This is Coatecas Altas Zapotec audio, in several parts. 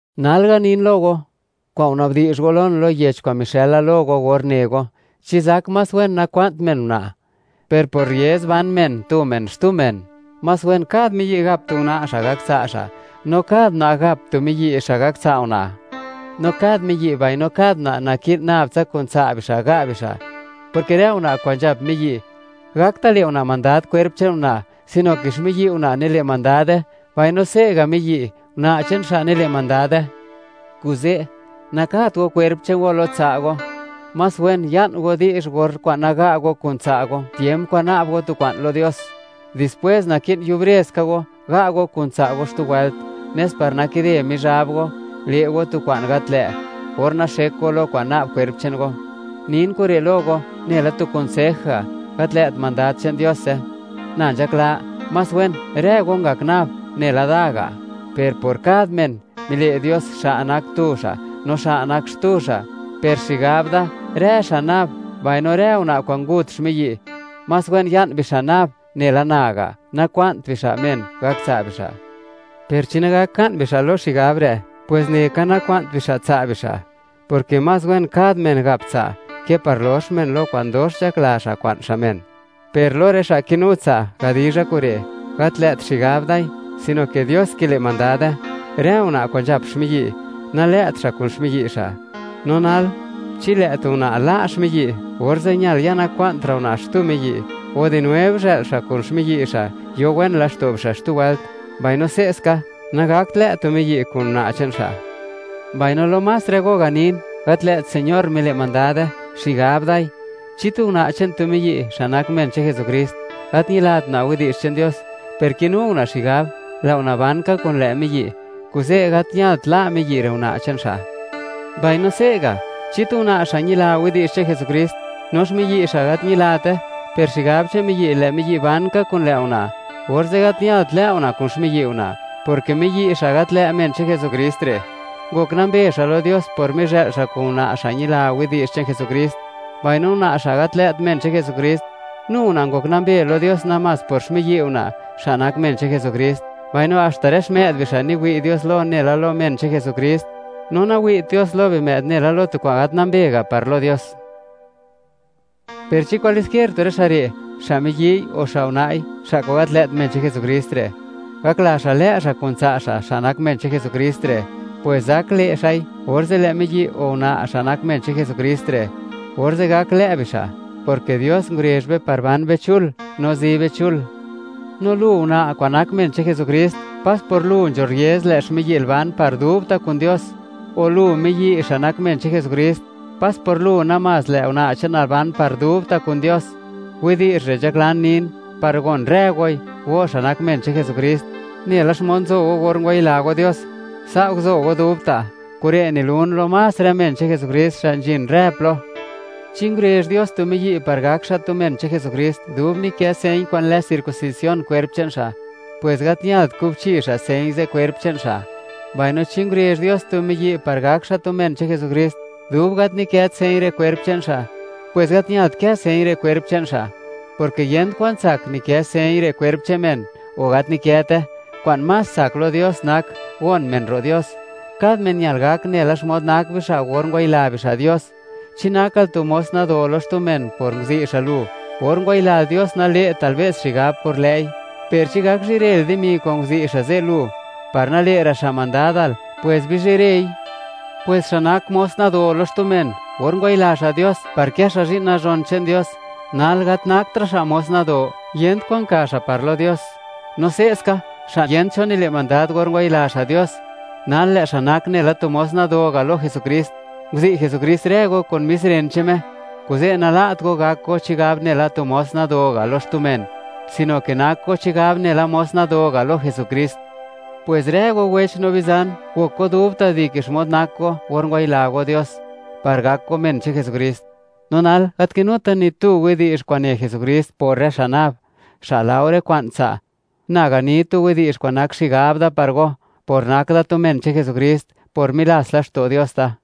Nal ganin lo go, kwa'n ngunabdi'zh go lon, lo yech kwa'n mixë'l go or ne go: “Chi zak más wen nakwa'nt men una'.” Per por rriez ban men tu men xtu men, más wen kad miyi' gap tu una' xa' gak tsa' xa', no kad una' gap tu miyi' xa' gak tsa' una'. No kad miyi' mbaino kad una' naki'n nab tsa kun tsa' bixa' ga' bixa', porke rë una' kwa'n nzhap miyi', gakta' le' una' mandad kwerp che'n una', sino ke xmiyi' una' nile' mandad kwerp che'n una'; mbaino se'ga' miyi', una' che'n xa' nile' mandad kwerp che'n miyi'. Kuze', nakat go kwerp che'n go lo tsa' go. Más wen, ya'n go di'zh or na'b go tu kwa'n lo Dios, naga't go; dispwes orze' gaka ga' go kun tsa' go xtu wëlt, nes par nakide Mizhab go, le' go tu kwa'n gat lë', or naxek go lo kwa'n na'b kwerp che'n go. Nin kure' lo go, nela tu kunsej ga', gat lë't mandad che'n Diose. Na nzhakla, ¡más wen rë go ngak nab nela da ga'!; per por kad men, nile' Dios, xa' nak tu xa', no xa' nak xtu xa'. Per xigab da, rë xa' nab, mbaino rë una' kwa'n ngut xmiyi', más wen ya'n bixa' nab nela na ga', nakwa'nt bixa' men gak tsa' bixa'. Per chi nagak ka'n bixa' lo xigab re', pwes neka kwa'n bixa' tsa' bixa', porke más wen, kad men gap tsa', ke par lox men lo kwa'n dox nzhakla men, kwa'n men tsa' men. Per lo nabtsa rë xa' kinu tsa', gadizha kure': Gat lë't xigab dai, sino ke Dios kile' mandade: Rë una' kwa'n nzhap xmiyi', nalë't xa' kun xmiyi' xa'. No nal, chi lë' tu una' la' xmiyi', orze' ñal, ya nakwa'ntra' una' xtu miyi', o di nuev, zhë'l xa' kun xmiyi' xa', yo wen laxto' bixa' xtu wëlt, mbaino se'ska, nagakt lë' tu miyi' kun una' che'n xa'. Mbaino lo más rë go ganin, gat lë't Señor mile' mandade, xigab dai. Chi tu una' che'n tu miyi', xa' nak men che'n Jesukrist, gat ñilat una' widi'zh che'n Dios, per kinu una' xigab, lë' una' ban ka kun lë' miyi', kuze' gat ñalt la' miyi' re' una' che'n xa'. Mbaino se'ga', chi tu una' xa' ñila widi'zh che'n Jesukrist, no xmiyi' xa' gat ñilate, per xigab che'n miyi', lë' miyi' ban ka kun lë' una', orze' gat ñalt lë' una' kun xmiyi' una', porke miyi' xa' gat lë' men che'n Jesukrist re', ngok nambe xa' lo Dios por mizhë'l xa' kun una' xa' ñila widi'zh che'n Jesukrist; mbaino una' xa' gat lë't men che'n Jesukrist, nu una' ngok nambe lo Dios namás por xmiyi' una', xa' nak men che'n Jesukrist. Mbaino haxta rë xmë'd bixa', niwi' Dios lo nela lo men che'n Jesukrist, no nawi't Dios lo bimë'd nela tu kwa'n gat nambe ga' par lo Dios. Per chi kwalesquier tu rë xa' re', xa' miyi'y o xa' una'i, xa' kwa'n gat lë't men che'n Jesukrist re', gakla xa' lë' xa' kun tsa' xa', xa' nak men che'n Jesukrist re', pwes zak le' xa'i. Orze' lë' miyi' o una', xa' nak men che'n Jesukrist re', orze' gak lë' bixa', porke Dios ngurezh be par ban be chul, no zi be chul. No lu, una', kwa'n nak men che'n Jesukrist, pas por lu nzho rriez, lë' xmiyi'l ban par dubta' kun Dios; o, lu miyi', xa' nak men che'n Jesukrist, pas por lu namás, lë' una' che'nal ban par dubta' kun Dios. Widi'zh re' nzhaklan nin, par gon rë goi, go xa' nak men che'n Jesukrist: Nela xmod nzo go or ngwayila go Dios, sa' guzo go dubta'. Kure' nilun lo más rë men che'n Jesukrist xa' nzhin rë plo. Chi ngurezh Dios tu miyi' par gak xa' tu men che'n Jesukrist, dub nikë señ kwa'n lë circuncisión kwerp che'n xa', pwes gat ñalt kubchi xa' señ ze' kwerp che'n xa'; mbaino chi ngurezh Dios tu miyi' par gak xa' tu men che'n Jesukrist, dub gat nikët señ re' kwerp che'n xa', pwes gat ñalt kë señ re' kwerp che'n xa'. Porke yent kwa'n tsak, nikë señ re' kwerp che'n men, o gat nikëte; kwa'n más tsak lo Dios nak, gon men ro' Dios. Kad men ñal gak nela xmod nak bixa' or ngwayila bixa' Dios. Chi nakal tu mos nado lo xtu men por nguzi' xa' lu, or ngwayilal Dios; nale'tal be's xigab por lë'i; per chi gak zhirel dimi kwa'n nguzi' xa' ze' lu, par nale'ra' xa' mandadal, pwes bizhirei. Pwes xa' nak mos nado lo xtu men, or ngwayila xa' Dios, par kë xa' zhi'n nazhon che'n Dios, nal gat naktra' xa' mos nado; yent kwan ka xa' par lo Dios; no se'ska, xa' yent cho nile' mandad or ngwayila xa' Dios, nal lë' xa' nak nela tu mos nado ga' lo Jesukrist. Nguzi' Jesukrist rë go kun mis ren che'n Me. Kuze' nala't go gak go chigab nela tu mos nado ga' lo xtu men, sino ke nak go chigab nela mos nado ga' lo Jesukrist. Pwes rë go wech no bizan, gok go dubta' dike xmod nak go, or ngwayila go Dios, par gak go men che'n Jesukrist. No nal, gat kinuta ni tu widi'zh kwa'n ne Jesukrist por rë xa' nab, xa' laore kwa'n tsa'. Na gani tu widi'zh kwa'n nak xigab da par go, por nak da tu men che'n Jesukrist, por milats laxto' Dios da.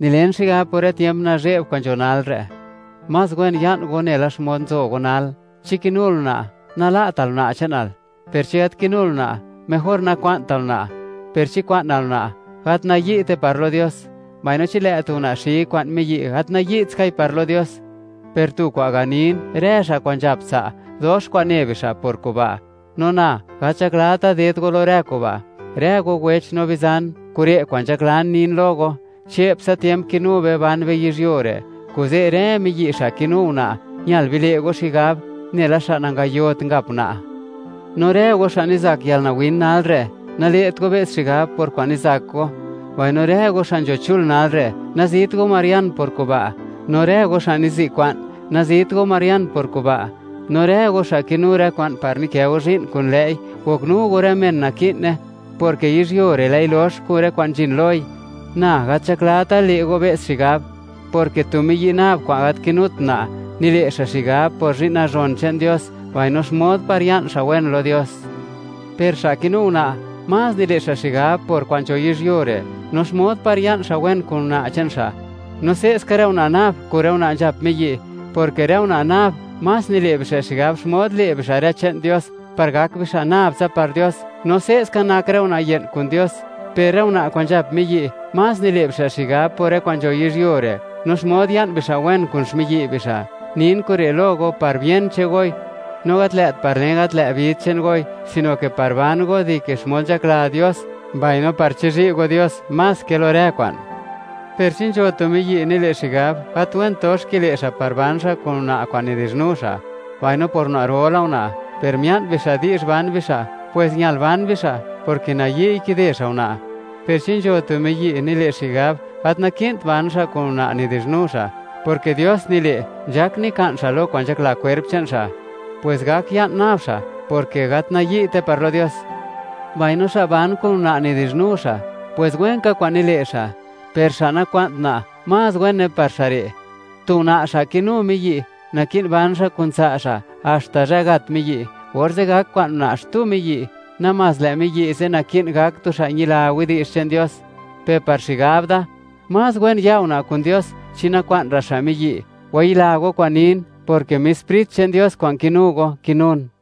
Nilen xigab, por rë tiemp nazhe'b kwa'n nzho nalre', más wen ya'n go nela xmod nzo go nal. Chi kinul una', nala'tal una' che'nal; per chi gat kinul una', mejor nakwa'ntal una'. Per chi kwa'nal una', gat nayi'te par lo Dios; mbaino chi lë' tu una' xi kwa'n miyi', gat nayi't skai par lo Dios; per tu kwa'n ganin, rë xa' kwa'n nzhap tsa', dox kwa'n ne bixa' por kuba', no na, gat nzhaklata ded go lo rë kuba'. Rë go wech no bizan, kure' kwa'n nzhaklan nin lo go: Che'ptsa tiemp kinu be, ban be yizhyuo re', kuze' rë miyi' xa' kinu una', ñal bile' go xigab nela xa' nangayot ngap una'. No rë go xa' nizak yalnawin nalre', nale't go be's xigab por kwa'n nizak go; mbaino rë go xa' nzho chul nalre', nazit go marian por kuba'. No rë go xa' nizi' kwa'n, nazit go marian por kuba'. No rë go xa' kinu rë kwa'n par nikë go zhi'n kun lë'i, goknu go rë men naki'ne, porke yizhyuo re', lë'i lox, kun rë kwa'n nzhin loi. Na gat nzhaklata le' go be's xigab, porke tu miyi' nab kwa'n gat kinut una', nile' xa' xigab por zhi'n nazhon che'n Dios, mbaino xmod par ya'n xa' wen lo Dios. Per xa' kinu una', más nile' xa' xigab por kwa'n nzho yizhyuo re', no xmod par ya'n xa' wen kun una' che'n xa'. No se'ska, rë una' nab kun rë una' nzhap miyi', porke rë una' nab más nile' bixa' xigab xmod le' bixa' rë che'n Dios, par gak bixa' nab tsa par Dios; no se'ska nak rë una' ye'n kun Dios. Per rë una' kwa'n nzhap miyi' más nile' bixa' xigab por rë kwa'n nzho yizhyuo re', no xmod ya'n bixa' wen kun xmiyi' bixa'. Nin kure' lo go par bien che'n goi, no gat lë't par len gat lë' vid che'n goi, sino ke par ban go dike xmod nzhakla Dios, mbaino par chizhi' go Dios más ke lo rë kwa'n. Per chi nzho tu miyi' nile' xigab, gat went dox kilë' xa' par ban xa' kun una' kwa'n nidi'zhnu xa', mbaino por una'ro la una', per mia'n bixa' di'zh ban bixa', pues ñal ban bixa', porke nayi'y kide xa' una'. Per chi nzho tu miyi', nile' xigab, gat naki'nt ban xa' kun una' nidi'zhnu xa', porke Dios nile', nzhak nika'n xa' lo kwa'n nzhakla kwerp che'n xa', pues gak ya'n nab xa', porke gat nayi'te par lo Dios. Mbaino xa' ban kun una' nidi'zhnu xa', pwes wen ka kwa'n nile' xa'; per xa' nakwa'n una', más wene par xa' re'. Tu una' xa' kinu miyi', naki'n ban xa' kun tsa' xa' haxta zhë gat miyi', orze' gak kwa'n una' xtu miyi', namás lë' miyi' ze' naki'n gak tu xa' ñila widi'zh che'n Dios. Per par xigab da, más wen ya una' kun Dios chi nakwa'n ra' xa' miyi'. Wayila go kwa'n nin, porke mis Sprit che'n Dios kwa'n kinu go, kinun.